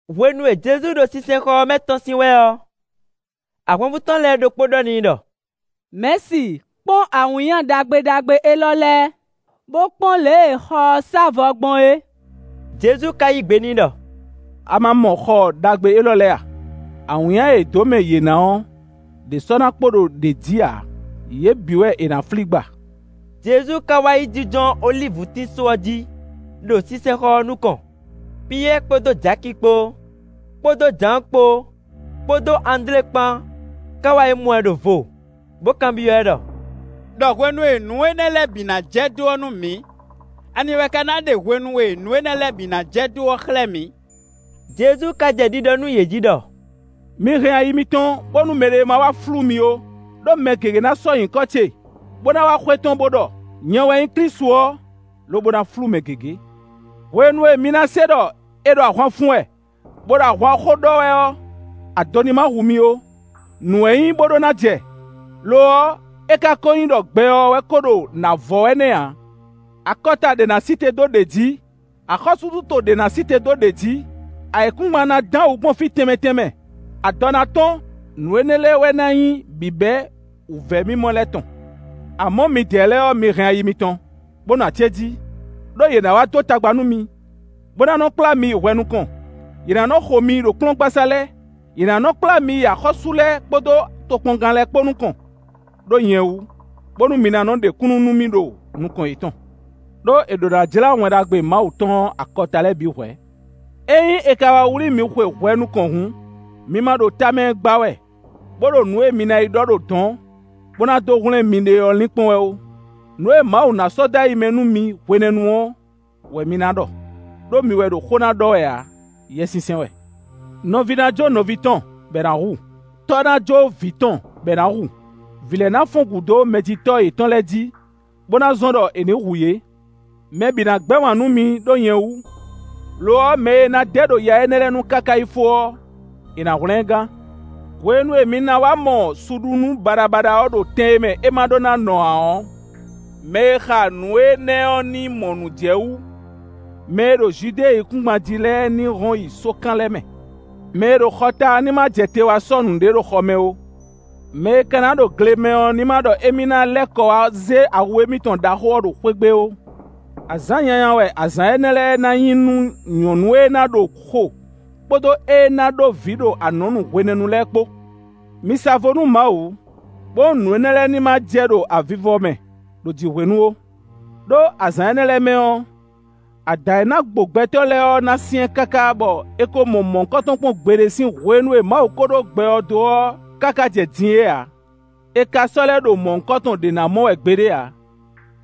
Hwenu e Jezu ɖo sinsɛnxɔ ɔ́ mɛ tɔ́n sín wɛ ɔ́, ahwanvú tɔn lɛ́ɛ ɖokpó ɖɔ n'i ɖɔ: “Mɛ̌si, kpɔ́n awǐnnya ɖagbe ɖagbe élɔ́ lɛ́ɛ, bó kpɔ́n lě e xɔ ɔ́ sá vɔ gbɔn é.” Jezu ka yí gbe n'i ɖɔ: “A ma mɔ xɔ ɖaxó élɔ́ lɛ́ɛ a? Awǐnnya e è dó mɛ yě ná ɔ́, ɖě sɔ́ ná kpo ɖo ɖě jí ǎ; yě bǐ wɛ è nǎ flí gba.” Jezu ka wá yi jínjɔ́n olívutín só ɔ́ jí, ɖo sinsɛnxɔ ɔ́ nukɔn. Piyɛ́ɛ kpódó Jaki kpó, kpódó Jǎan kpó, kpódó Andlé kpán ká wá yi mɔ ɛ, ɖo vo, bó kanbyɔ́ ɛ ɖɔ: “Đɔ hwenu e nǔ énɛ́ lɛ́ɛ bǐ ná jɛ dó ɔ́ nú mǐ; ani wɛ ka ná ɖe hwenu e nǔ énɛ́ lɛ́ɛ bǐ ná jɛ dó ɔ́ xlɛ́ mǐ?” Jezu ka jɛ ɖiɖɔ nú yě jí ɖɔ: “Mi hɛn ayi mitɔn bónú mɛɖé ma wá flú mi ó. Đó mɛ gěgé ná sɔ́ nyǐkɔ ce bó ná wá xwetɔ́n bó ɖɔ: ‘Nyɛ wɛ nyí Klísu ɔ́,’ lobo ná flú mɛ gěgé. Hwenu e mi ná se ɖɔ è ɖo ahwan fun wɛ, bó ɖo ahwan xó ɖɔ wɛ ɔ́, ado ní má hu mi ó; nǔ wɛ nyí bó ɖó ná jɛ; lo ɔ́, é ka ko nyí ɖɔ gbɛ ɔ́ wɛ ko ɖo nǎ vɔ wɛ nɛ́ ǎ. Akɔta ɖě ná sí te dó ɖě jǐ, axɔ́súɖuto ɖě ná sí te dó ɖě jí, ayǐkúngban ná dán wǔ gbɔn fí tɛnmɛ tɛnmɛ, adɔ ná tɔ́n. Nǔ énɛ́ lɛ́ɛ wɛ ná nyí bǐbɛ́ wǔvɛ́mimɔ lɛ́ɛ tɔn. “Amɔ̌, midɛɛ lɛ́ɛ ɔ́, mi hɛn ayi mitɔn, bó nɔ acéjí, ɖó yě ná wá dó tagba nú mi, bó ná nɔ́ kplá mi yi hwɛ nukɔn; yě ná nɔ́ xo mi ɖo kplɔ́ngbasá lɛ́ɛ, yě ná nɔ́ kplá mi yi axɔ́sú lɛ́ɛ kpódó tokpɔngán lɛ́ɛ kpó nukɔn, ɖó nyɛ wú, bónú mi ná nɔ́ ɖe kúnnu nú mì ɖo nukɔn yětɔn. Đó è ɖǒ ná jlá Wɛn Ɖagbe Mawu tɔn ɔ́ akɔta lɛ́ɛ bǐ hwɛ̌. Ényí è ka wá wlí mi xwe hwɛ nukɔn hǔn, mi ma ɖo tamɛ gba wɛ, bó ɖo nǔ e mi ná yi ɖɔ ɖo dɔ̌n, bó ná dó hwlɛ́n miɖée ɔ́ linkpɔ́n wɛ ó; nǔ e Mawu ná sɔ́ dó ayi mɛ nú mi hwenɛ́nu ɔ́ wɛ mi ná ɖɔ, ɖó mi wɛ ɖo xó ná ɖɔ wɛ ǎ, Yɛsinsɛn wɛ. Nɔví ná jó nɔví tɔn, bɔ è nǎ hu; tɔ́ ná jó vǐ tɔn bɔ è nǎ hu; vǐ lɛ́ɛ ná fɔ́n gǔ dó mɛjitɔ́ yětɔn lɛ́ɛ jí, bó ná zɔ́n ɖɔ è nǐ hu yě. Mɛ bǐ ná gbɛ́ wǎn nú mi ɖó nyɛ wú; lo ɔ́, mɛ e ná dɛ ɖo ya énɛ́ lɛ́ɛ nu káká yi fó ɔ́, è nǎ hwlɛ́n ɛ gán. “Hwenu e mi ná wá mɔ suɖunú baɖabaɖa ɔ́ ɖo tɛn e mɛ é ma ɖó ná nɔ ǎ ɔ́, (mɛ e xa nǔ énɛ́ ɔ́ ní mɔ nǔ jɛ wú); mɛ e ɖo Judée yíkúngban jí lɛ́ɛ ní hɔn yi sókan lɛ́ɛ mɛ. Mɛ e ɖo xɔ ta ɔ́ ní ma jɛ te wá sɔ́ nǔɖé ɖo xɔ mɛ ó. Mɛ e ka ná ɖo gle mɛ ɔ́ ní má ɖɔ émí ná lɛ́ kɔ wá zé awu émítɔn ɖaxó ɔ́ ɖo xwé gbe ó. Azǎn nyanya wɛ azǎn énɛ́ lɛ́ɛ ná nyí nú nyɔ̌nu e ná ɖo xo, kpódó ée ná ɖó vǐ ɖo anɔ̌nu hwenɛ́nu lɛ́ɛ kpó. Mi sa vo nú Mawu, bónú nǔ énɛ́ lɛ́ɛ ní má jɛ ɖo avivɔ mɛ, ɖo jǐ hwenu ó. Đó azǎn énɛ́ lɛ́ɛ mɛ ɔ́, adǎn e ná gbo gbɛtɔ́ lɛ́ɛ ɔ́ ná syɛ́n káká, bɔ è ko mɔ mɔ̌hunkɔtɔn kpɔ́n gbeɖé sín hwenu e Mawu ko ɖó gbɛ ɔ́ dó ɔ́ káká jɛ din é ǎ; è ka sɔ́ lɛ́ ɖo mɔ̌hunkɔtɔn ɖě ná mɔ wɛ gbeɖé ǎ.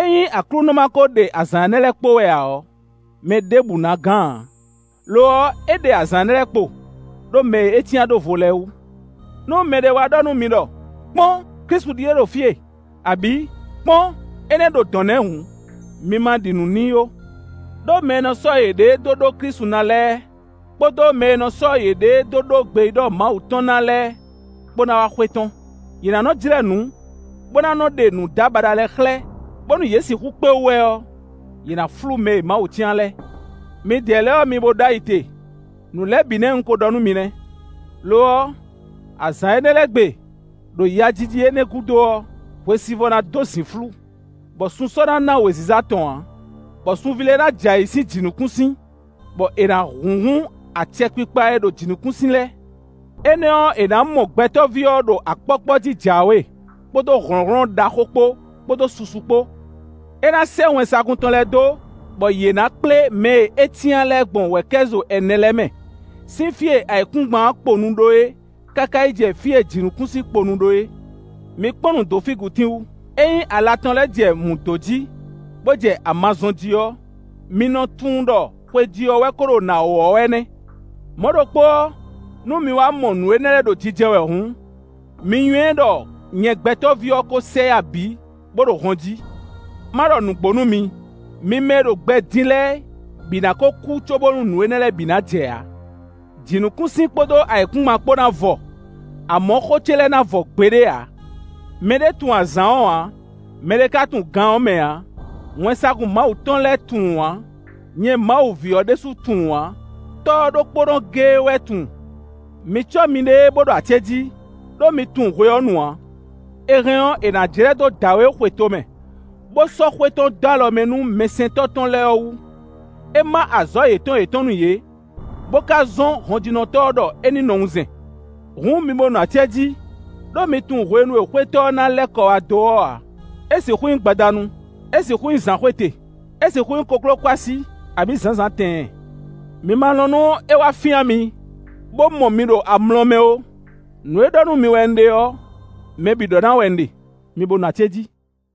Ényí Aklúnɔ ma ko ɖe azǎn énɛ́ lɛ́ɛ kpo wɛ ǎ ɔ́, mɛ ɖěbǔ ná gán ǎ; lo ɔ́, é ɖe azǎn énɛ́ lɛ́ɛ kpo, ɖó mɛ e é cyán ɖó vo lɛ́ɛ wú. “Nú mɛɖé wá ɖɔ nú mi ɖɔ: ‘Kpɔ́n, Klísu ɖíe ɖo fí e,’ abǐ: ‘Kpɔ́n, énɛ́ ɖo dɔ̌n nɛ́’ hǔn, mi ma ɖi nǔ n'i ó. Đó mɛ e nɔ sɔ́ yěɖée dó ɖó Klísu ná lɛ́ɛ kpódó mɛ e nɔ sɔ́ yěɖée dó ɖó gbeyíɖɔ Mawu tɔn ná lɛ́ɛ kpó ná wá xwetɔ́n. Yě ná nɔ́ jlɛ́ nǔ, bó ná nɔ́ ɖe nǔdábaɖa lɛ́ɛ xlɛ́, bónú yě sixú kpé wú wɛ ɔ́, yě ná flú mɛ e Mawu cyán lɛ́ɛ. Midɛɛ lɛ́ɛ ɔ́, mi bo ɖó ayi te, nǔ lɛ́ɛ bǐ nɛ́ un ko ɖɔ nú mi nɛ́. “Lo ɔ́, azǎn énɛ́ lɛ́ɛ gbe, ɖo yajiji énɛ́ gúdo ɔ́, hwesivɔ́ ná dó zǐnflú; bɔ sun sɔ́ ná ná wěziza tɔn ǎ, bɔ sunví lɛ́ɛ ná jɛ ayǐ sín jǐnukúnsin, bɔ è nǎ húnhún acɛkpikpa e ɖo jǐnukúnsin lɛ́ɛ. Énɛ́ ɔ́, è nǎ mɔ Gbɛtɔ́ví ɔ́ ɖo akpɔ́kpɔ́ jí jǎwe, kpódó hlɔ̌nhlɔ́n ɖaxó kpó, kpódó susu kpó. É ná sɛ́ wɛnsagun tɔn lɛ́ɛ dó, bɔ yě ná kplé mɛ e é cyán lɛ́ɛ gbɔn wɛ̌kɛ́zo ɛnɛ lɛ́ɛ mɛ, sín fí e ayǐkúngban ɔ́ kponu ɖó é, káká yi jɛ fí e jǐnukúnsin kponu ɖó é. “Mi kpɔ́n nǔ dó fígitín wu: ényí ala tɔn lɛ́ɛ jɛ mǔ dó jí, bo jɛ ama zɔ́n jí ɔ́, mi nɔ tunwun ɖɔ xwejí ɔ́ wɛ ko ɖo nǎ wɔ̌ wɛ nɛ́. Mɔ̌ ɖokpó ɔ́, nú mi wá mɔ nǔ énɛ́ lɛ́ɛ ɖo jijɛ wɛ hǔn, mi nywɛ́ ɖɔ nyɛ Gbɛtɔ́ví ɔ́ kó sɛ yá bǐ, bó ɖo hɔn jí. Má ɖɔ nǔgbó nú mi: mi mɛ e ɖo gbɛ din lɛ́ɛ bǐ ná kó kú cóbónú nǔ énɛ́ lɛ́ɛ bǐ ná jɛ ǎ. Jǐnukúnsin kpódó ayǐkúngban kpó ná vɔ, amɔ̌, xó ce lɛ́ɛ ná vɔ gbeɖé ǎ. “Mɛ ɖé tunwun azǎn ɔ́ ǎ; mɛɖé ka tunwun gan ɔ́ mɛ ǎ; wɛnsagun Mawu tɔn lɛ́ɛ tunwun ǎ; nyɛ Mawu ví ɔ́ ɖésú tunwun ǎ; Tɔ́ ɔ́ ɖokpónɔ géé wɛ tunwun. Mi cɔ́ miɖée, bó ɖo acéjí, ɖó mi tunwun hwe ɔ́ nu ǎ. È hɛn ɔ́, è nǎ jlɛ́ dó dǎwe e xwe tomɛ, bó sɔ́ xwé tɔn dó alɔ mɛ nú mɛsɛntɔ́ tɔn lɛ́ɛ ɔ́ wú; é má azɔ̌ yětɔn yětɔn nú yě, bo ka zɔ́n hɔnjínɔtɔ́ ɔ́ ɖɔ é ní nɔ wunzɛn. Hǔn, mi bo nɔ acéjí, ɖó mi tunwun hwenu e xwétɔ́ ɔ́ na lɛ́ kɔ wá dó ɔ́ ǎ; é sixú nyí gbadanu, é sixú nyí zǎnxwete, é sixú nyí kokló kɔ́ así, abǐ zǎnzǎn tɛɛn. Mi ma lɔn nú é wá fyán mi, bó mɔ mi ɖo amlɔ mɛ ó. Nǔ e ɖɔ nú mi wɛ un ɖe ɔ́, mɛ bǐ ɖɔ ná wɛ un ɖe; mi bo nɔ acéjí.”